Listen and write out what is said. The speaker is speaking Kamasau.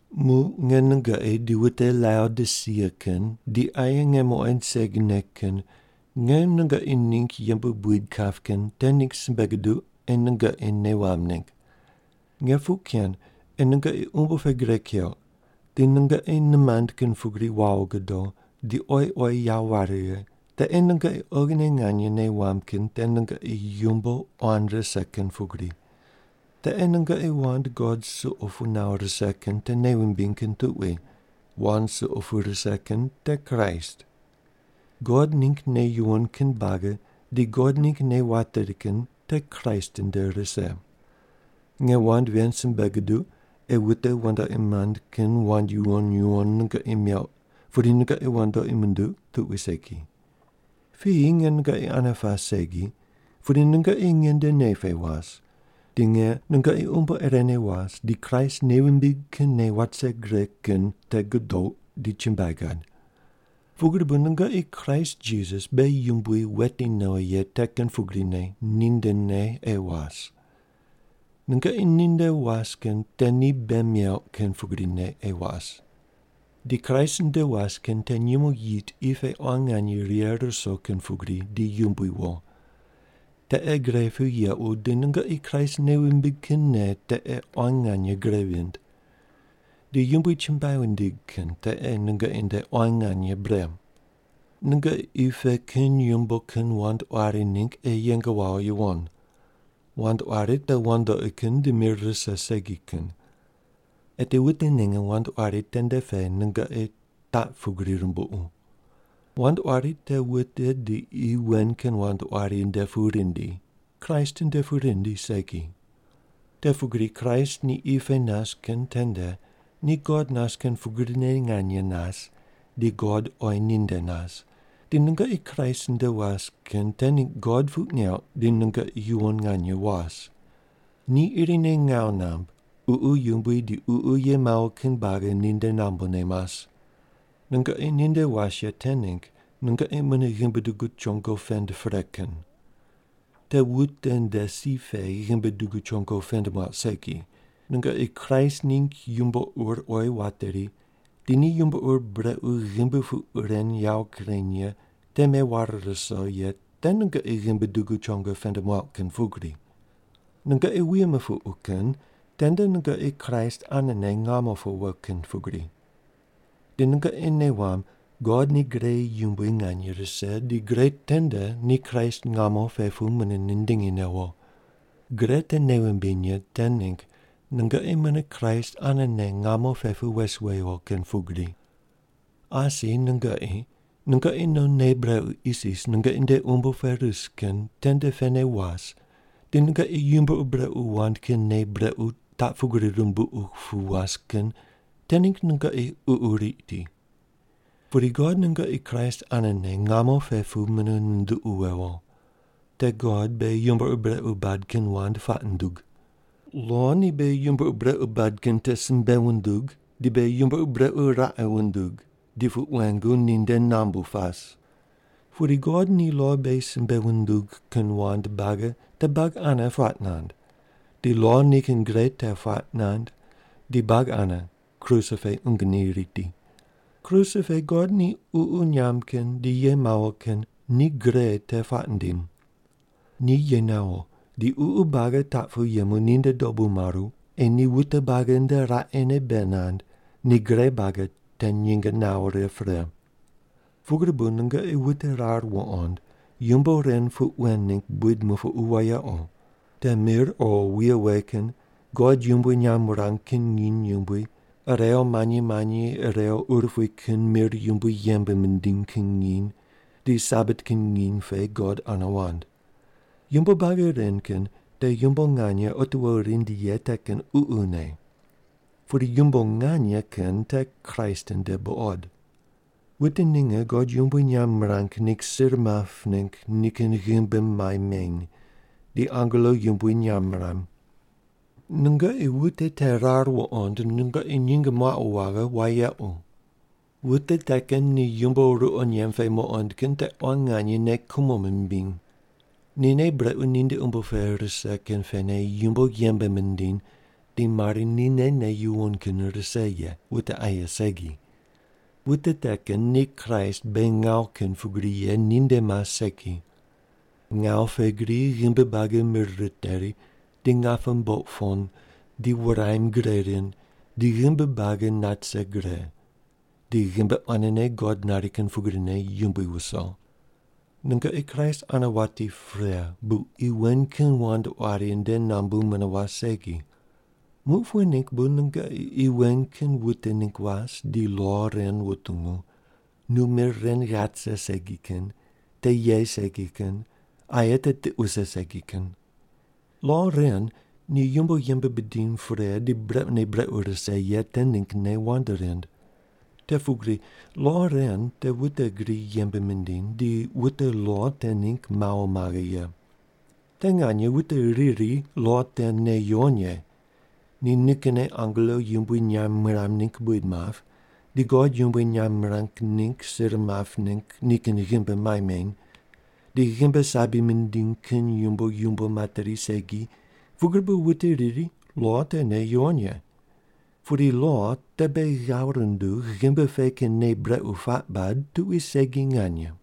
Muq nge nungoqi di wute Laodisia kin di aye nge muqoind segine kin nge nungoqi ningg yembe buid kap kin te ningg simbe guduq ei nungoqi nei wamb ningg. Nge puq ken ei nungoqi umbo pe gre keuq di nungoqi nimand kin pugri wawo gudo di oyi oyi yawo ware righe, te ei nungoqi oghine nganye nei wamb kin te nungoqi yumbo quan rise kin pugri. Te ei nungoqi wand God suqo pu nawo rise kin te nei wumbiny kin tuqui, wand suqo pu rise kin te Kraist. God ningg nei yuwon kin buagi di God ningg nei wateri kin te Kraist nde rise. Nge wand ven simbe guduq ei wute wandoqi mand kin wand yuwon yuwon nungoqi meuq pudi nungoqi wandoqi munduq tuqui segi. Piyi nge nungoqi ane pas segi pudi nungoqi nge nde nei pe was, di nge nungoqi umbo irene was di Kraist nei wumbig kin nei wat vise gre kin te gudouq di chumbuai gad. Pugri bu nungoqi Kraist Jisas beghi Yumbui weti nowi ye te kin pugrine nindene ei was. Nungoqi ninde was kin te ni bei meuq kin pugrine ei was. Di Kraist nde was kin te nyumo yit qi pe quan nganye righe ruso kin pugri di yumbui wo. Te ei gre pu yequ, di nungoqi Kraist nei wumbig kin nei te ei quan nganye gre vind. Di Yumbui chumbuai wundig kin te ei nungoqi nde quan nganye bre. Nungoqi qi pe kin yumbo kin wand quari ningg ei yeng wawo yuwon. Wand quari te wandoqi kin di mir rise segi ye. Eti wute ninge wand quari tende pe nungoqi taq pugri rumbuqu. Wand quari te wute di qi wen kin wand quari nde pu rindi, Kraist nde pu rindi segi. Te pugri Kraist ni qi pe nas kin tende ni God nas kin pugrine nganye nas di God oyi ninde nas, di nungoqi Kraist nde was kin te ningg God puq neuq di nungoqi yuwon nganye was. Ni irine ngawu namb, ququ yumbui di ququ ye mawo kin buagi ninde nambune mas. Nungoqi ninde was ye te ningg nungoqi mune ghimbi dugu chongo pend pre kin. Te wute nde si pe ghimbi dugu chongo pend muauq segi, nungoqi Kraist ningg yumbo ur oyi wateri di ni yumbo ur brequ ghimbi puq ren yawo kureny ye te meware ruso ye te nungoqi ghimbi dugu chongo pend muauq kin pugri. Nungoqi wuye mupuqu kin tende nungoqi Kraist anene ngamo pe wo kin pugri. Di nungoqi nei wamb God ni gre yumbui nganye rise di gre tende ni Kraist ngamo pe pu mune nindingi newo. Gre te nei wumbiny ye te ningg nungoqi mune Kraist anene ngamo pe pu wes wewo kin pugri. Asi nungoqi, nungoqi non nei brequ isis nungoqi nde umbo pe ris kin tende pene was di nungoqi yumbo ur brequ wand kin nei brequ taq pugri rumbuqu pu was kin te ningg nungoqi ququ riti. Pudi God nungoqi Kraist anene ngamo pe pu mune nunduqu wewo. Te God beghi yumbo ur brequ bad kin wand puaq nundug. Lo ni beghi yumbo ur brequ bad kin te simbe wundug di beghi yumbo ur brequ raqe wundug di puq wengu ninde nambu pas. Pudi God ni lo beghi simbe wundug kin wand buagi te buagi ane puaq nand di lo nikin gre te puaq nand di buagi ane kruse pe qungu ni riti. Kruse pe God ni ququ nyamb kin di ye mawo kin ni gre te puaq nindim. Ni ye nawo di ququ buagi taq pu yemu ninde dobu maru ei ni wute buagi nde raqene bei nand ni gre buagi te nyinge nawo righe pre. Pugri bu nungoqi wute rar wuqond yumbo ren puq wen ningg buid mupuqu wayequ: Te mir o wuye we kin, God yumbui nyamb wurang kin nginy yumbui, irew manyi manyi irew urupui kin mir yumbui yembe mindiny kin nginy, di Sabat kin nginy pe God ane wand. Yumbo buagi ren kin te yumbo nganye otiwo rindi ye te kin ququne. Pudi yumbo nganye kin te Kraist nde buqod. Wute ninge God yumbui nyamb mirang ningg sir map ningg nikin ghimbi mai meny, di angelo yumbui nyamb miram. Nungoqi wute te rar wuqond nungoqi nyinge muaqu waghe wayequ. Wute te kin ni yumbo ruqo nyemb pe muqond kin te quan nganye nei kumo mimbiny. Ni nei brequ ninde umbo pe rise kin pene yumbo yembe mindiny di mari nine nei yuwon kin rise ye, wute aye segi. Wute te kin ni Kraist beghi ngawu kin pugri ye ninde mas segi. Ngawu pe gri ghimbi buagi mir riteri di ngape mboq pon di wuraim gre rind di ghimbi buagi nat rise gre, di ghimbi quanene God nari kin pugrine yumbui wuso. Nungoqi Kraist ane wati pre bu qi wen kin wand quari nde nambu mune was segi. Muq pughe ningg bu nungoqi qi wen kin wute ningg was di lo ren wutungu: “Nu mir ren ghat rise segi kin. Te ye segi kin. Aye te tiq wuse segi kin.” Lo ren ni yumbo yembe bidiny pre di brequne brequ rise ye te ninggne wand rind. Te pugri lo ren te wute gri yembe mindiny di wute lo te ningg mawo maghe ye. Te nganye wute riri lo te nei yuwon ye. Ni nikinne angelo yumbui nyamb miram ningg buid map, di God yumbui nyamb mirang ningg sir map ningg nikin ghimbi mai meny, di ghimbi sabi mindiny kin yumbo yumbo materi segi pugri bu wute riri lo te nei yuwon ye. Pudi lo te beghi ghav rundug ghimbi pe kin nei brequ puaq bad tuqui segi nganye.